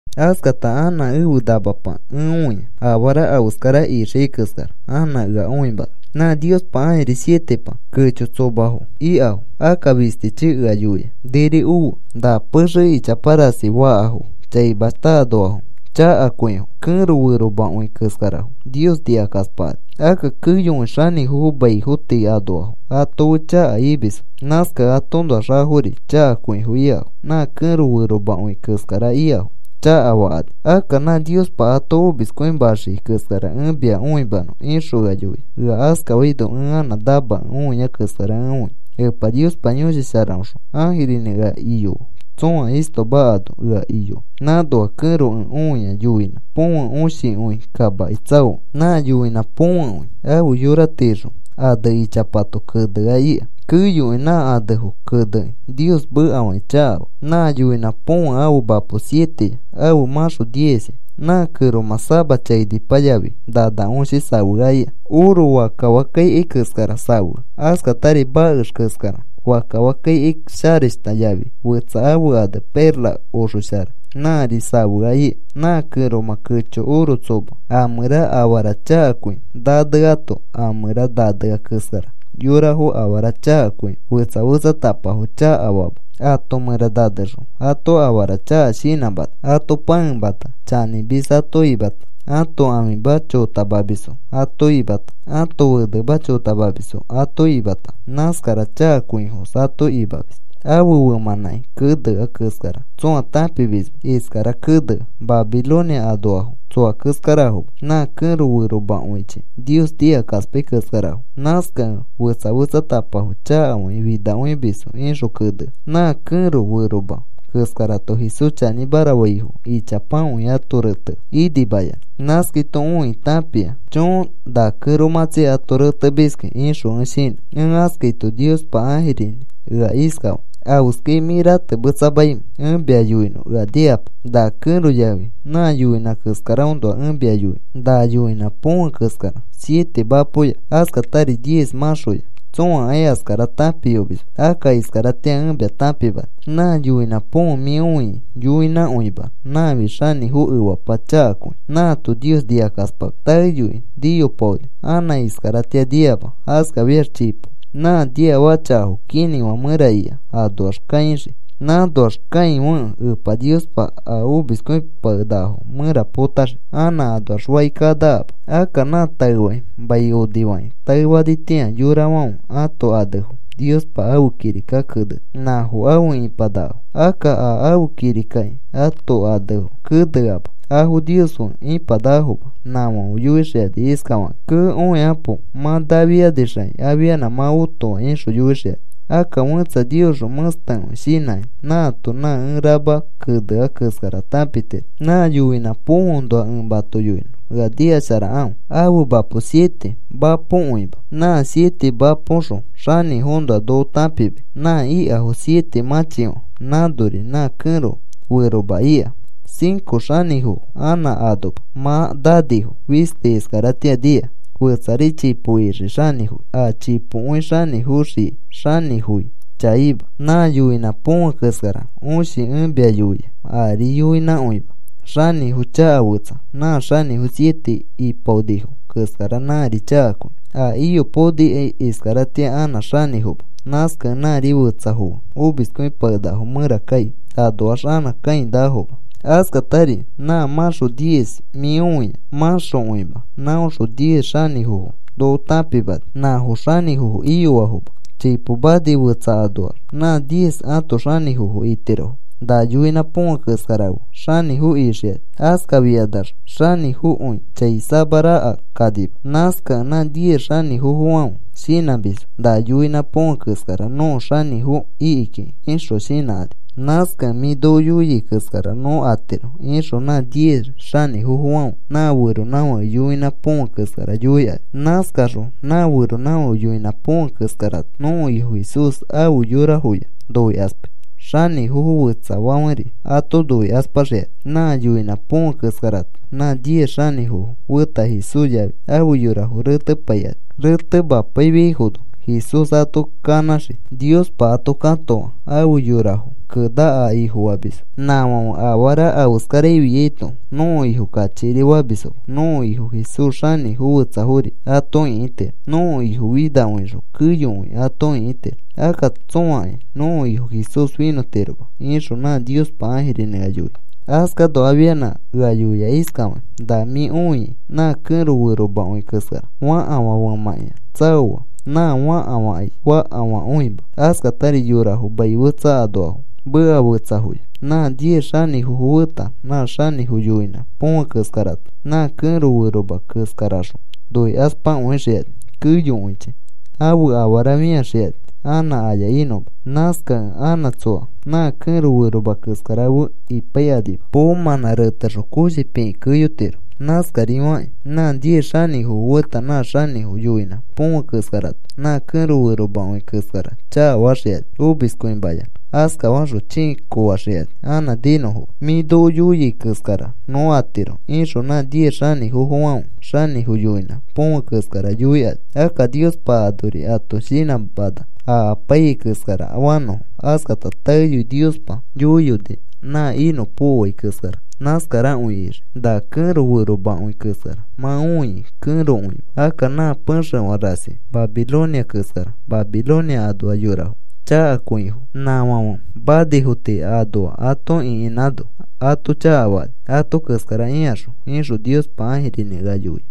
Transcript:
Askata anã ẽfe namapa ẽ õia. Afara afeskara ixiai keskara anã ea õimana. Nã Niospa ãjiri sietepa kecho tsomafo ikafo akka fistichi ea yoia: “Niri ofe. Na pexe ichapa rasi fakafãfo chaimashta anoafo chakakõifo. Kẽro feromakõi keskarafo Nios nikakaspakani. Akka keyokõi xanĩfofo maifo tii anoafo ato fe chaka imisfo. Nãskakẽ atoõnoax afori chakakõifo ikafo. Nã kẽro feromakõi keskara ikafo chakafakani. Akka nã Niospa ato omiskõimaxiai keskara ẽ mia õimanõ,” ixõ ea yoia. Ea askafaino ẽ anã namakẽ õia keskara ẽ õia. Epa Niospa Yõshi Sharaõxõ ãjirinĩ ea iyoa tsõa istoma ano ea iyoa. Nãnoa kẽro ẽ õia yoinã põfe õshikõi kamaki tsaokẽ. Nã yoinã põfekõi ãfe yora tiixõ ane ichapato kenea ika. Keyokõi nã anefo kenekĩ Nios mekafakĩ chakafaa. Nã yoinã põfe ãfe mapo sieteya. Ãfe mãxo diezya. Nã kẽromã sama chainipa yafi nana õshi safea ika. Oro fakka fakka ikai keskara safea. Askatari makex keskara fakka fakka ikai sharashta yafi fetsa ãfe ane perla oxoshara, nãri safea ika. Nã kẽromã kecho oro tsoma a mẽra afara chakakõi naneato, a mẽra nanea keskara yorafo afara chakakõi fetsa fetsatapafo chakafama. Ãto mẽra nanexõ ato afara chaka shinãmana. Ato pãemata, chanĩmis ato imata, ãto ãfima chotamisfo ato imata, ãto fenema chotamamisfo ato imata, nãskara chakakõifos ato imamis. Ãfe femãnãki kenea keskara tsõa tãpimisma. Iskara kenea: “Babilonia anoafo tsoa keskarafoma. Nã kẽro feromakõichi Nios nikakaspai keskarafo. Nãskakẽ fetsa fetsatapafo chakafakĩ finakõimisfo,” ixõ kenea. Nã kẽro feroma keskarato Jesús chanĩmara faifo ichapakõi ato retea inimayanã. Nãskaito õikĩ tãpia. “Choo, na kẽromãtsi ato retemiski,” ixõ ẽ shinã. Ẽ askaito Niospa ãjirinĩ ea iskafaa: “¿Afeskai mĩ ratemetsamaimẽ? Ẽ mia yoinõ, ea nikapo. Na kẽro yafi nã yoinã keskaraõnoa ẽ mia yoinõ. Na yoinã põfe keskara siete mapoya askatari diez mãxoya tsõakai askara tãpiyomisma. Akka iskaratĩa ẽ mia tãpimani. Nã yoinã põfe mĩ õiai yoinãkõima. Nãfi xanĩfo efapa chakakõi. Nãato Nios nikakaspamis. Taeyoi niyopaoni. Anã iskaratĩa niama. Askafiax chipo nã niafaka chakafo kinĩfã mẽra ika anoax kaixii. Nãnoax kãifekẽ Epa Niospa a omiskõipakenakafo mẽra potaxii anã anoax faki kanakama. Akka nã taefakĩ mai onifakĩ taefanitĩa yorafãfe ãto anefo Niospa ãfe kirika keneni, nãfo afe ipanakafo. Akka a ãfe kirikaki ãto anefo keneama, afo Nios fe ipanakafoma. Nãfãfe yoixikani iskafakakĩ: ‘¡Kee, õikapo! Mã nafianixakĩ afianã mã otoa,’ ixõ yoixikani. “Akka fẽtsa Niosxõ mẽstekõi shinãkĩ nãato nã ẽ rama kenea keskara tãpitiro. Nã yoinã põfeõnoa ẽ mato yoinõ, ea nikasharakãfe. Ãfe mapo siete mapokõima. Nã siete mapoxõ xanĩfoõnoa noko tãpimai. Nã ikafo siete mãchifã. Nãnori nã kẽro feroma ika. Cinco xanĩfofo anã anoma. Mã nanifo. Fisti iskaratĩa nia. Fetsari chipo ixii xanĩfoi. A chipokõi xanĩfoxiai xanĩfoi chaima. Nã yoinã põfe keskara õshi ẽ mia yoia, ari yoinãkõima, xanĩfo chaka fetsa. Nã xanĩfo siete ipaonifo keskara nãri chakakõi. A iyopaonikai iskaratĩa anã xanĩfoma. Nãskakẽ nãri fetsafo fe omiskõipakenakafo mẽra kai anoax anã kãinakafoma. “Askatari nã mãxo diez mĩ õiai mãxokõima. Nãõxõ diez xanĩfofo noko tãpimani. Nãfo xanĩfofo iyoafoma. Chipo mani fetsafo anoax nã diez ãto xanĩfofo itirofo. Na yoinã põfe keskara fe xanĩfo ixikani. Askafikanax xanĩfoi chai samaraka kanima. Nãskakẽ nã diez xanĩfofofãfe shinãmisfo: ‘Na yoinã põfe keskara nõko xanĩfo iki kiki,’ ixõ shinãkani. Nãskakẽ, ‘Mĩ noko yoiai keskara nõ atiro,’ ixõ nã diez xanĩfofofãfe nã feronãfake yoinã põfe keskara yoikani. Nãskaxõ nã feronãfake yoinã põfe keskarato nõko Ifo Jesús afe yorafoya noikaspai, xanĩfofo fetsafãferi ato noikaspaxikani. Nã yoinã põfe keskarato nã diez xanĩfofo feta Jesús yafi afe yorafo retepaikani. Retemapaifiaifono Jesús ato kanãxii. Niospa ato katoa afe yorafo kena a Ifofamisfo. Nãfãfe afara afeskarafiaito nõko Ifo kachikiri famisfoma. Nõko Ifo Jesús xanĩfo fetsafori ato ĩkitiro. Nõko Ifo finakõixõ keyokõi ato ĩkitiro. Akka tsõakai nõko Ifo Jesús finõtiroma,” ixõ nã Niospa ãjirinĩ ea yoia. Askano afianã ea yoia iskafakĩ: “Na mĩ õiai nã kẽro feromakõi keskara, fakafã femãkĩa tsaoa nã fakafãkai fakafãkõima, askatari yorafo mai fetsa anoafo, meka fetsayafo. Nã diez xanĩfofo feta nã xanĩfo yoinã põfe keskarato nã kẽro feroma keskarakaxõ noikaspakõixikani. Keyokõichi ãfe afara fĩaxikani anã aya inõma. Nãskakẽ anã tsoa nã kẽro feroma keskara fe ipaikanima. Poomãnã retexõ koshi pikĩ keyotiro. Nãskafakĩri nã diez xanĩfofo feta nã xanĩfo yoinã põfe keskarato nã kẽro feromakõi keskara chakafaxikani omiskõimayanã. Askafaxõ chĩi koofaxikani anã ninõma. ‘Mĩ noko yoiai keskara nõ atiro,’ ixõ nã diez xanĩfofofãfe xanĩfo yoinã põfe keskara yoikani. Akka Niospa anori ato shinãmana a apaiyai keskara fanõfo. Askata taeyoi Niospa yoiyoni nã inõpokoai keskara nãskarakõi ixii. Na kẽro feromakõi keskara mã õiai kẽrokõima, akka nã pexefã rasi Babilonia keskara. Babilonia anoa yorafo chakakõifo. Nãfãfe manifo tii anoa ato ĩkinãno ato chakafakani ato keskara ikaxõ,” ixõ Niospa ãjirinĩ ea yoia.